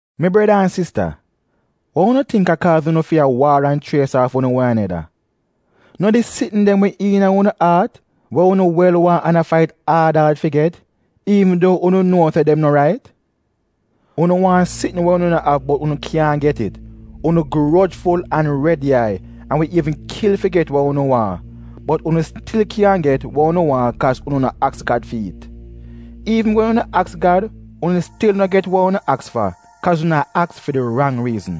Mi breda an sista, wa unu tingk a kaaz unu fi a waar an chries aaf unu wan aneda? No di sitn dem we iina unu aat we unu wel waahn an a fait aad aad fi get, iivn duo unu nuo se dem no rait? Unu waahn sitn we unu no av bot unu kyaahn get it. Unu grojful an red yai an wi iivn kil fi get wa unu waahn! Bot unu stil kyaahn get we unu waahn kaaz unu no aks Gad fi it. Iivn wen unu aks Gad, unu stil no get wa unu aks fa, kaaz unu a aks fi di rang riizn.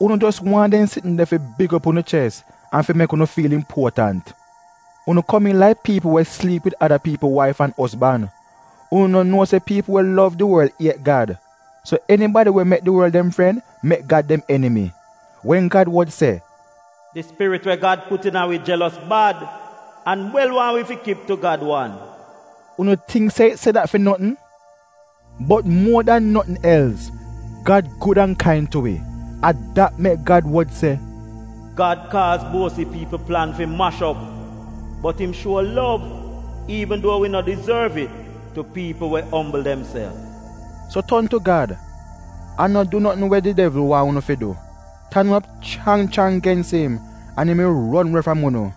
Unu jos waahn dem sitn de fi big op unu ches an fi mek unu fiil impuotant. Unu komiin laik piipl we sliip wid ada piipl waif an ozban! Unu no nuo se piipl we lov di worl iet Gad? So enibadi we mek di worl dem fren mek Gad dem enimi. Wen Gad wod se, “Di spirit we Gad put iina wi jelos bad an wel waahn wi fi kip tu Gad wan” — unu tingk se it se dat fi notn? Bot muo dan notn els, Gad gud an kain tu wi. A dat mek Gad wod se, “Gad kaaz buosi piipl plan fi mash op bot im gud an kain tu piipl we ombl demself.” So ton tu Gad an no du notn we di devl waahn unu fi du. Tan op chrang chrang gens im, an im wi ron we fram unu.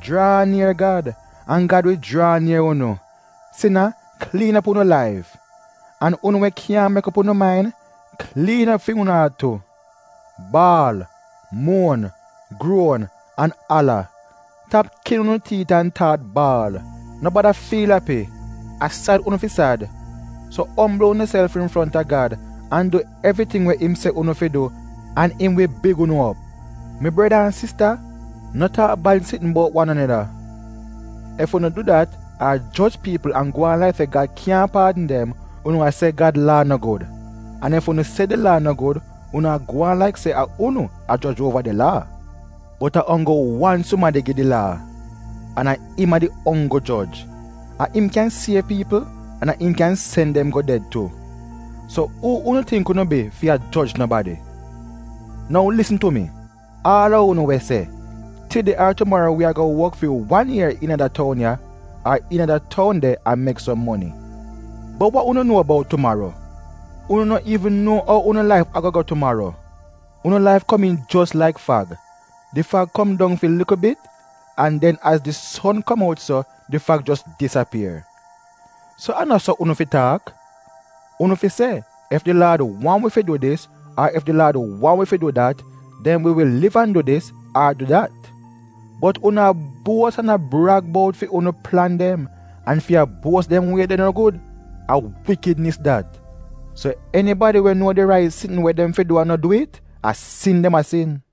Jraa nier Gad, an Gad wi jraa nier unu. Sina kliin op unu laif. An unu we kyaahn mek op unu main, kliin op fi unu aat tu. Baal, muon, gruon, an ala. Tap kin unu tiit an staat baal. No bada fiil api, a sad unu fi sad. So ombl unuself infronta Gad, an du evriting we im se unu fi du an im wi big unu op. Mi breda an sista, no taak bad sitn buot wan aneda! Ef unu du dat ar joj piipl an gwaan laik se Gad kyaahn paadn dem, unu a se Gad Laa no gud. An ef unu se di Laa no gud unu a gwaan laik se a unu a joj uova di Laa. Bot a onggl wan sumadi gi di Laa, an a im a di onggl joj. A im kyan siev piipl an im kyan sen dem go ded tu. So uu unu tingk unu bi fi a joj nobadi? Nou lisn tu mi, aal a unu we se, “Tide ar tumaro wi ago wok fi wan ier iina da toun ya, ar iina da toun de an mek som moni.” Bot wa unu nuo buot tumaro? Unu no iivn nuo ou unu laif ago go tumaro. Unu laif komiin jos laik fag. Di fag kom dong fi likl bit, an den az di son kom out so, di fag jos disapier. So a no so unu fi taak. Unu fi se, “Ef di Laad waahn wi fi du dis, ar ef di Laad waahn wi fi du dat, den wi wi liv an du dis, ar du dat.” Bot unu a buos an a brag bout fi unu plan dem, an fi a buos dem wie de no gud — a wikidnis dat. So enibadi we nuo di rait sitn we dem fi du an no du it, a sin dem a sin.